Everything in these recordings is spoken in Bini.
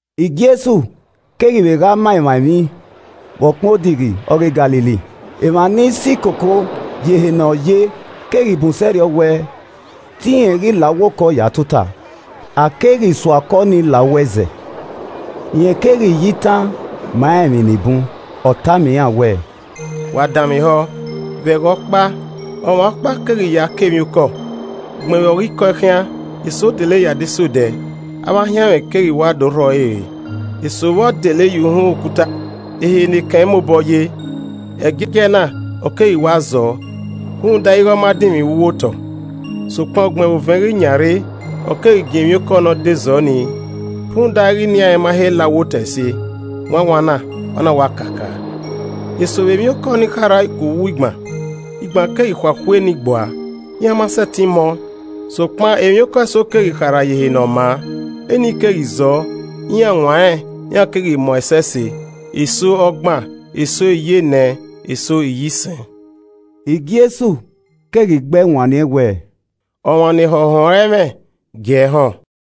Jesu keghi vbe gha ma emwa emwi vbe ọkpẹn odighi ọghe Galili. Emwa ni si koko ye ehe ne ọ ye keghi bun sẹrriọ wẹ te irẹn ghi la uwu okọ ya tota. A keghi sua okọ nii la uwu ẹzẹ. Rẹn keghi ya itan ma iran emwi ni bun, ọ tama iran wẹẹ: “Wa danmwehọ, vbe ẹghẹ ọkpa, ọmwa ọkpa keghi ya kọ emwiokọ. Ugbẹn vbe ọ ghi kọ ẹe khian, eso dele ye adesẹ odẹ, avbe ahianmwẹ keghi wa do rhọ ẹre re. Eso vbọ dele ye uhunmwu okuta, ehe ne ekẹn i mobọ ye. Ẹgiẹgiẹ na, ọ keghi wa zọọ, rhunmwuda ighe ọ ma dinmwi vbe uwu otọ. Sokpan ugbẹn vbe ovẹn ghi yan rre, ọ keghi giẹn emwiokọ ne ọ da zọ nii, rhunmwuda ighe inian rẹn ma he la uwu otọ ẹse, wanwan na, ọ na wa kakaa. Eso vbe emwiokọ ni na kharha ku uwu igban. Igban keghi khuakhua enii gbua, iran ma sẹtin mọ. Sokpan, emwiokọ eso keghi kharha ye ehe ne ọ maa, enii keghi zọọ, iran wan rẹn, iran keghi mọ ẹsẹse, eso ọgban, eso iyenẹ, eso iyisẹn.” Jesu keghi gbe ẹe wanniẹn wẹẹ, “Ọmwa ne ehọ họn ẹre ẹmwẹ, gi ẹe họn.”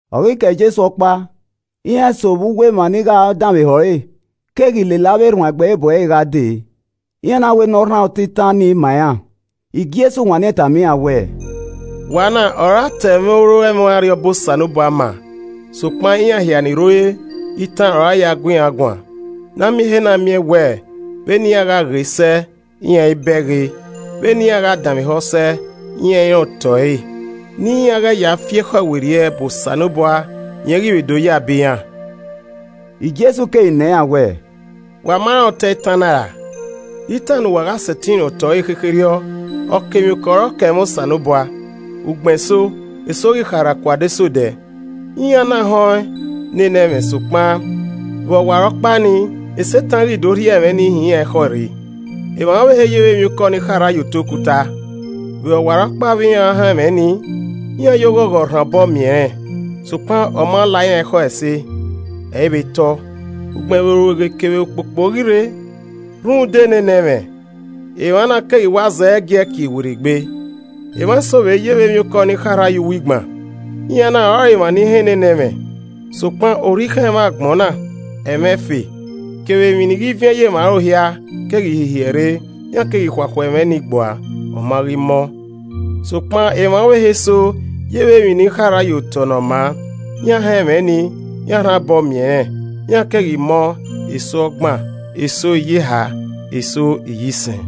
Ọ ghi kẹe Jesu ọkpa, iran eso vbe uwu emwa ni gha danmwehọ ẹre keghi lele avbe erhuanegbe bu ẹre gha dee, iran na wẹ ne ọ rhan otọ itan nii ma iran. Jesu wanniẹn tama iran wẹẹ, “Wa na ọre a ta oro ẹmwẹ Arriọba Osanobua ma sokpan, iran hia ni rre ore, itan ọre a ya gu iran guan. Na miẹn ehe na miẹn wẹẹ: “ ‘Vbe ne iran gha ghe sẹ, iran i bẹghe! Vbene iran gha danmwehọ sẹ, iran i rẹn otọ ẹre, ne iran ghẹ ya fi ekhọe werriẹ bu Osanobua, rẹn ghi vbe do ya bọ iran.’” Jesu keghi nọ iran wẹẹ, “Wa ma rẹn otọ itan na ra? De itan ne uwa gha sẹtin rẹn otọ ẹre khekherriọ? Ọkemwiokọ ọre ọ kọ ẹmwẹ Osanobua. Ugbẹnso, eso ghi kharha ku adesẹ odẹ. Iran na họn ne ne ẹmwẹ sokpan, vbe ọwarọkpa ni Setan ghi do rhie ẹmwẹ ni hin iran ekhọe rre. Emwa ọvbehe ye vbe emwiokọ ni kharha ye otọ okuta. Vbe ọwarọkpa vbe iran họn ẹmwẹ nii, iran ya oghogho rhan obọ miẹn ẹnrẹn. Sokpan ọ ma la iran ekhọe ẹse, ẹ i vbe tọ. Ugbẹn vbe orueghe kevbe ukpokpo ghi rre rhunmwuda ne ne ẹmwẹ, emwa na keghi wa zẹgiẹ kie werriegbe. Emwa eso vbe ye vbe emwiokọ ni kharha ye uwu igban. Iran na ọrọre emwa ni họn nene ẹmwẹ. Sokpan orhikhan ẹmwẹ agbọn na, ẹmwẹ ẹfe, kevbe emwi ni ghi viẹn ye emwa aro hia, keghi hihiẹ rre, iran keghi khuakhua ẹmwẹ ni gbua, ọ ma ghi mọ. Sokpan emwa ọvbehe eso yevbe emwi ne a kọ ye otọ ne ọ maa. Iran họn ẹmwẹ nii, iran rhan obọ miẹn ẹnrẹn, iran keghi mọ, eso ọgban, eso iyeha, eso iyisẹn.”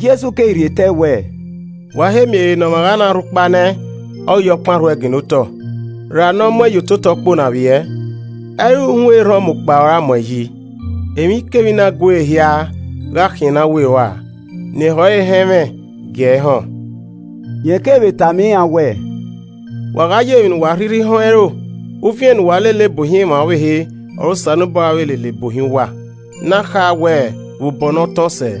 Jesu keghi rhie tẹe wẹẹ, “Wa he miẹn ehe ne ọmwa gha na rhu ukpa nẹ, ọ ghi ya ọkpan rhu ẹe ginna otọ, ra ne ọ mu ẹn ye ototọ ukpo ne a vbiẹ? Ẹ i re uhunmwu erhan ọmukpa ọre a mu ẹn yi. Emwikemwi ne a guere hia gha khian ne a were ua. Ne ehọ ẹre họn ẹmwẹ gie ẹe họn.” Rẹn keghi vbe tama iran wẹẹ, “Wa gha ya emwi ne uwa a rhirhi họn ẹro, uviẹn ne uwa lele bu ohiẹn emwa ọvbehe, ọre Osanobua ra vbe lele bu ohiẹn uwa, ne a kha wẹ, vbe obọ ne ọ tọn sẹ.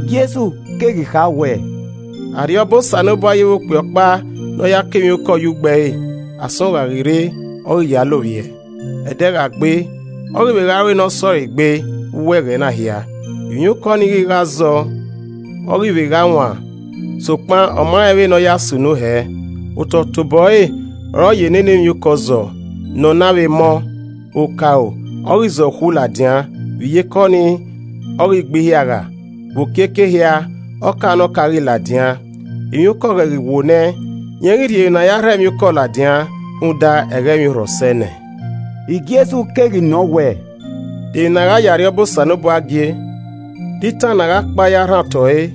Jesu keghi kha wẹẹ, “Arriọba Osanobua ye vbe okpia ọkpa ne ọ ya kọ emwi ye ugbo ẹre. Asọn gha ghi rre, ọ ghi ya lovbiẹ, ẹdẹ gha gbe, ọ ghi vbe gha ru ne ọ sẹ ọre egbe vbe uwu ẹghẹ na hia, emwiokọ nii ghi gha zọ, ọ ghi vbe gha wan. Sokpan, ọ ma rẹn vbene ọ ya sunu hẹ. Otọe tobọ ẹre ọre ọ ya nene emwiokọ zọ, ne ọ na vbe mọ; okaro, ọ ghi zọ ukhu ladian, vbe iyeke ọnii, ọ ghi gbe ihiagha, vbe okiekie ehia, ọka ne ọka ghi ladian. Emwiokọ ghẹ ghi wo nẹ, rẹn ghi rhie emwi ne a ya rhọ emwiokọ ladian, rhunmwuda ẹghẹ emwiorhọ sẹ nẹ.” Jesu keghi nọ wẹẹ, “De emwi ne a gha ya Arriọba Osanobua gie? De itan ne a gha kpa ya rhan otọ ẹre?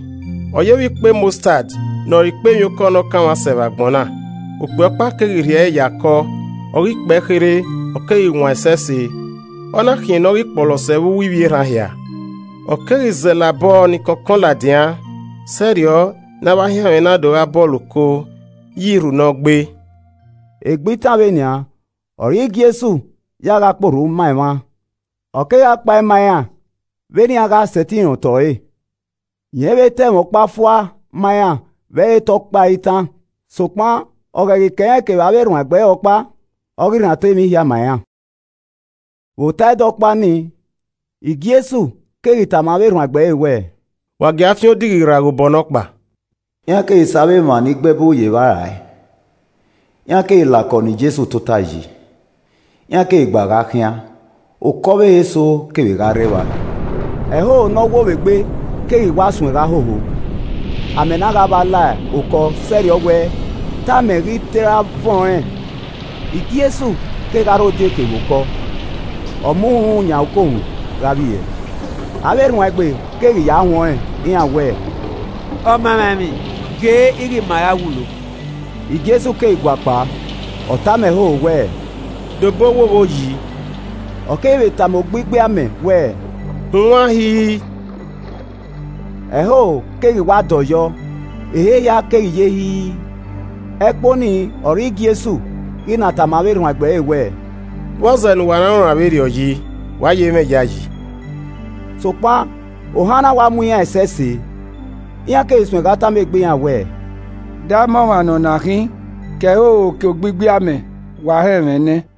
Ọ ye vbe ikpẹ mọstad ne ọ re ikpẹ emwiokọ ne ọ kanmwa sẹ vbe agbọn na. Okpia ọkpa keghi rhie ẹre ya kọ. Ọ ghi kpee kherhe, ọ keghi wan ẹsẹse, ọ na khian ne ọ ghi kpọlọsẹ vbe uwu ivbi erhan hia. Ọ keghi zẹlẹ abọ ni kọnkọn ladian, sẹrriọ ne avbe ahianmwẹ na do gha bọlọ oko ye irhu ne ọ gbe.” Egbe itan vbenian, ọre Jesu ya gha kpe orhu ma emwa, ọ kegha kpae ma iran vbene iran gha sẹtin rẹn otọ ẹre. Rẹn i vbe ta ẹmwẹ ọkpa fua ma iran vbe ẹ i re te ọ kpa ẹre itan, sokpan ọ ghẹ ghi kẹ irẹn kevbe avbe erhuanegbe ẹre ọkpa, ọ ghi rhan otọ emwi hia ma iran. Vbe ota ẹdẹ ọkpa nii, Jesu keghi tama avbe erhuanegbe ẹre wẹẹ, “Wa gia fian odighi rra ghe obọ nọkpa.” Iran keghi sẹ avbe emwa ni gbe ẹbu ye evba rae, iran keghi la okọ ne Jesu tota yi, iran keghi gba gha khian. Okọ ọvbehe eso kevbe gha rre evba. Ẹhoho ne ọ wo vbe egbe keghi wa suẹn gha hoho, amẹ na gha vba la okọ sẹrriọ wẹ te amẹ ghi te ra vuọn ẹnrẹn. Jesu kegha rre odieke vbe okọ, ọ mu uhunmwu yan ukohunmwu gha vbiẹ. Avbe erhuanegbe keghi ya huẹn ọnrẹn, iran wẹẹ, “Ọmamwaemwi, ghe ighe ma ra wulo.” Jesu keghi guakpao, ọ tama ẹhoho wẹẹ, “Dobọ owogho yi!” Ọ keghi vbe tama ogbigbi amẹ wẹẹ, “Hunwan hi i i!” Ẹhoho keghi wa dọyọ, ehe hia keghi ye hi i i. Ẹkpo ni ọre Jesu ghi na tama avbe erhuanegbe ẹre wẹẹ, “Vbọzẹ ne uwa na runran vberriọ yi? Wa i ye mwẹ iyayi?” Sokpan ohan na wa mu iran ẹsẹse, iran keghi suẹ gha tama egbe iran wẹẹ, “De ama ọmwa ne ọna khin? Ke ẹhoho, kevbe ogbigbi amẹ wa họn ẹmwẹ nẹẹn.”